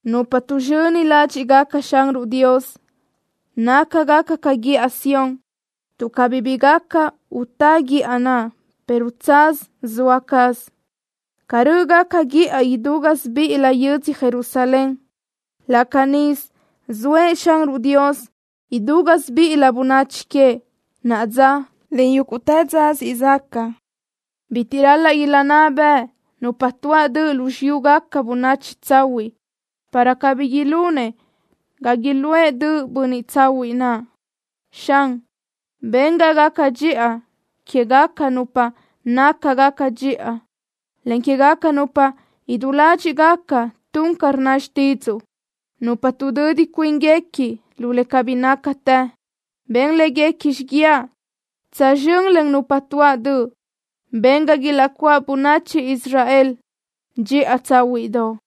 Nupa tuʼzxöni ládxiʼgaca Xanruʼ Dios nácagaca ca guíʼa Sión, tuʼ cabí bi gaca utá guíʼa naʼ, pero tsaz zoa caz. Ca rö́ʼgaca guíʼa idú gásibiʼilö yödzö Jerusalén, laʼ canísö zoëʼ Xanruʼ Dios idú gásibiʼilö bönachi queëʼ, naʼa dza, en yúguʼtë dza siʼ zaca. Bitiʼ ral-laʼ ilaʼnná bëʼ nupa tuáʼ döʼ lu xiyúgaca bönachi tsahuiʼ, para cabí iún ga iluʼë döʼ bönniʼ tsahuiʼ naʼ. Xan, ben ga gaca dxiʼa quégaca nupa nácagaca dxiʼa, en quégaca nupa idú ládxiʼgaca tun ca rnna xtídzuʼu. Nupa tuʼdödi cuínguequi lu le cabí nácatë, ben léguequi xiguiaʼ tsözxö́n len nupa tuáʼ döʼ. Ben ga ilaʼcuáʼ bönachi Israel dxiʼa tsáhuiʼdoʼ.